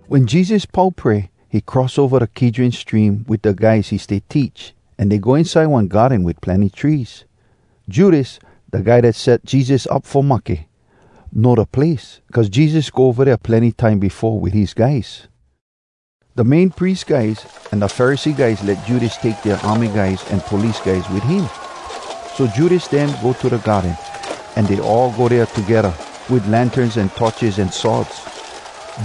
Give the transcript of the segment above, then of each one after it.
Wen Jesus pau pray, he cross ova da Kidron Stream wit da guys he stay teach, an dey go inside one garden wit plenny trees. Judas, da guy dat set Jesus up fo mahke, know da place, cuz Jesus go ova dea plenny time befo wit his guys. Da Main Pries guys an da Pharisee guys let Judas take dea army guys an police guys wit him. So Judas dem go to da garden, an dey all go dea togedda, wit lanterns an torches an swords.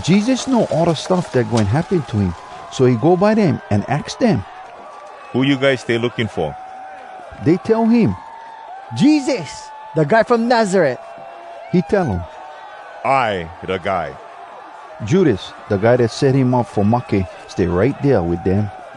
Jesus know all da stuff dat goin happen to him, so he go by dem an aks dem, “Who you guys stay looking fo?” Dey tell him, “Jesus, da guy from Nazaret.” He tell um, “I da guy.” Judas, da guy dat set him up fo mahke, stay right dea wit dem.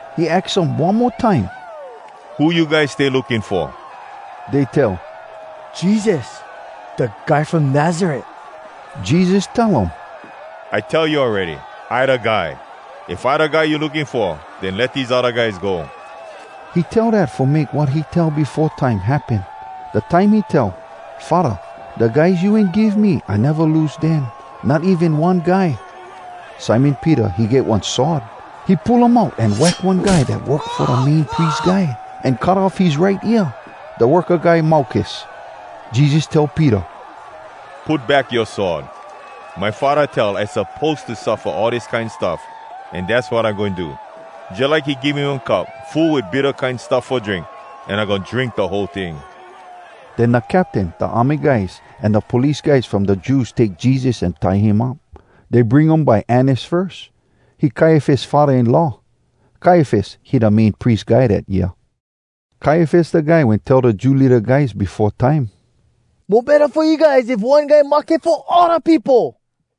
He aks um one mo time, “Who you guys stay looking fo?” Dey tell, “Jesus, da guy from Nazaret.” Jesus tell um, “I tell you awready, I da guy. If I da guy you looking fo, den let dese odda guys go.” He tell dat fo make wat he tell befo time happen, da time he tell “Faddah, Da guys you wen give me, I neva lose dem, not even one guy.” Simon Peter, he get one sword. He pull um out an wack one guy dat work fo da Main Pries Guy, an cut off his right ear. Da worka guy Malkus. Jesus tell Peter, “Put back yoa sword! My Faddah tell I suppose to suffa all dis kine stuff, an dass wat I goin do! Jalike he give me one cup full wit bitta kine stuff fo drink, an I goin drink da whole ting.” Den da captain, da army guys, an da police guys from da Jews take Jesus an tie him up. Dey bring um by Annas firs. He Kaiafas faddah-in-law. Kaiafas, he da Main Pries Guy dat year. Kaiafas da guy wen tell da Jew leada guys befo time, “Mo betta fo you guys if one guy mahke fo all da peopo.”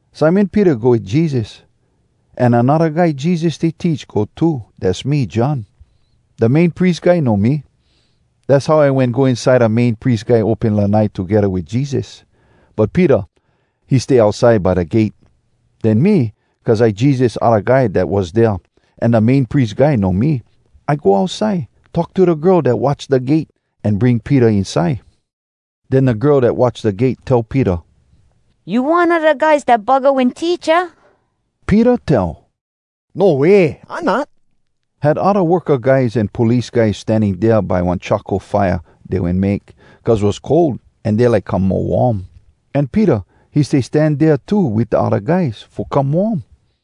Simon Peter go wit Jesus. An anodda guy Jesus stay teach go too—dass me John. Da Main Pries Guy know me. Dass how I wen go inside da Main Pries Guy open lanai togedda wit Jesus. But Peter, he stay outside by da gate. Den me, cuz I Jesus odda guy dat was dea, an da Main Pries Guy know me, I go outside, talk to da girl dat watch da gate, an bring Peter inside. Den da girl dat watch da gate tell Peter, “You one a da guys dat buggah wen teach, aah?” Peter tell, “No way! I not!” Had odda worka guys an police guys standing dea by one charcoal fire dey wen make, cuz was cold, an dey like come mo warm. An Peter, he stay stan dea too wit da odda guys, fo come warm.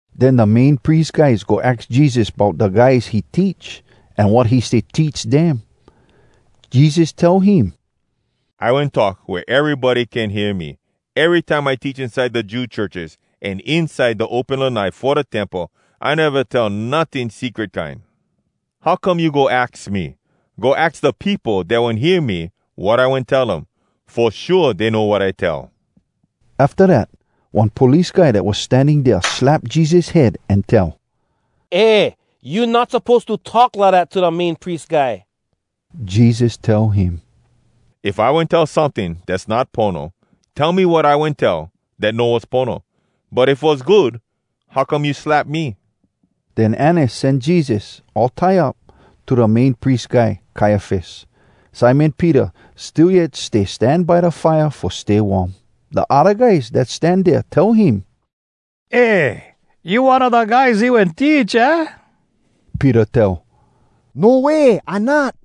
Den da Main Pries Guy go aks Jesus bout da guys he teach, an wat he stay teach dem. Jesus tell him, “I wen talk wea erybody can hear me. Erytime I teach inside da Jew churches an inside da open lanai fo da Temple. I neva tell notting secret kine. How come you go aks me? Go aks da peopo dat wen hear me, wat I wen tell um. Fo shua, dey know wat I tell.” Afta dat, one police guy dat was standing dea slap Jesus head an tell, “Eh! You not suppose to talk lidat to da Main Pries Guy!” Jesus tell him, “If I wen tell someting dass not pono, tell me wat I wen tell dat no was pono. But if was good, how come you slap me?” Den Annas sen Jesus, all tie up, to da Main Pries Guy, Kaiafas. Simon Peter still yet stay stan by da fire fo stay warm. Da odda guys dat stan dea tell him, “Eh! You one a da guys he wen teach, aah?” Peter tell, “No way! I not!”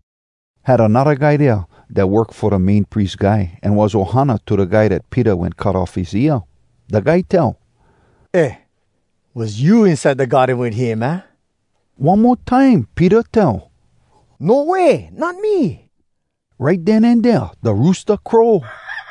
Had anodda guy dea dat work fo da Main Pries Guy an was ohana to da guy dat Peter wen cut off his ear. Da guy tell, “Eh! Was you inside da garden wit him, aah?” One mo time Peter tell, “No way! Not me!” Right den an dea, da roosta crow.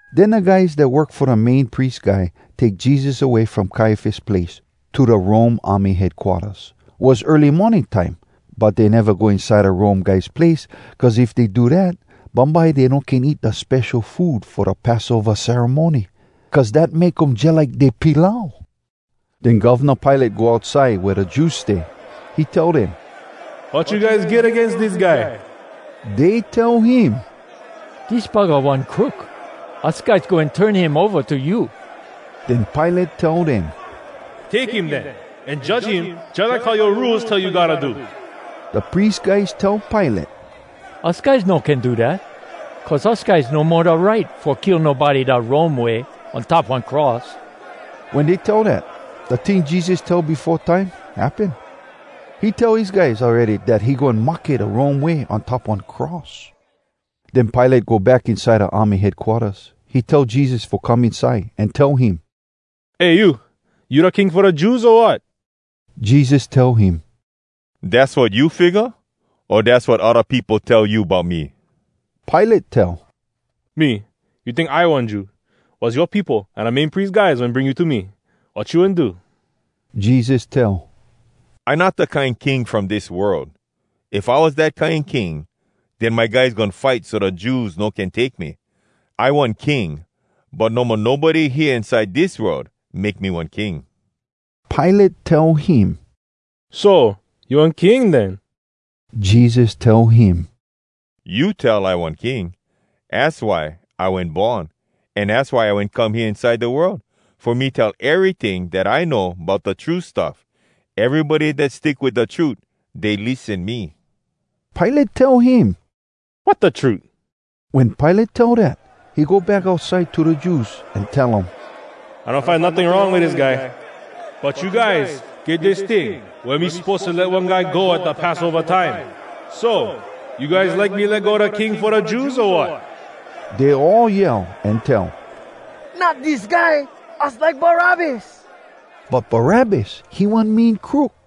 Den da guys dat work fo da Main Pries Guy take Jesus away from Kaiafas place to da Rome army headquarters. Was early morning time. But dey neva go inside da Rome guys place, cuz if dey do dat, bumbye dey no can eat da spesho food fo da Passova ceremony, cuz dat make um jalike dey pilau. Den Govna Pilate go outside wea da Jews stay. He tell dem, “Wat you guys get agains dis guy?” Dey tell him, “Dis buggah one crook. Us guys goin turn him ova to you.” Den Pilate tell dem, “Take him den an judge him jalike how yoa Rules tell you gotta do.” Da pries guys tell Pilate, “Us guys no can do dat, cuz us guys no mo da right fo kill nobody da Rome way, on top one cross.” Wen dey tell dat, da ting Jesus tell befo time, happen. He tell his guys awready dat he goin mahke da Rome way on top one cross. Den Pilate go back inside da army headquarters. He tell Jesus fo come inside, an tell him, “Eh, you! You da king fo da Jews, o wat?” Jesus tell him, “Dass wat you figga? O dass wat odda peopo tell you bout me?” Pilate tell, “Me? You tink I one Jew? Was yoa peopo an da Main Pries guys wen bring you to me. Wat you wen do?” Jesus tell, “I not da kine king from dis world. If I was dat kine king, den my guys goin fight so da Jews no can take me. I one king, but no mo nobody hea inside dis world make me one king.” Pilate tell him, “So, you one king den?” Jesus tell him, “You tell I one king. Az why I wen born, an az why I wen come hea inside da world—fo me tell eryting dat I know bout da true stuff. Erybody dat stick wit da trut, dey lissen me.” Pilate tell him, “Wat da trut?” Wen Pilate tell dat, he go back outside to da Jews, an tell um, “I no find notting wrong wit dis guy. But you guys get dis ting wea me suppose to let one guy go at da Passova time. So, you guys like me let go da King fo da Jews, o wat?” Dey all yell an tell, “Not dis guy! Us like Barabbas!” But Barabbas, he one mean crook.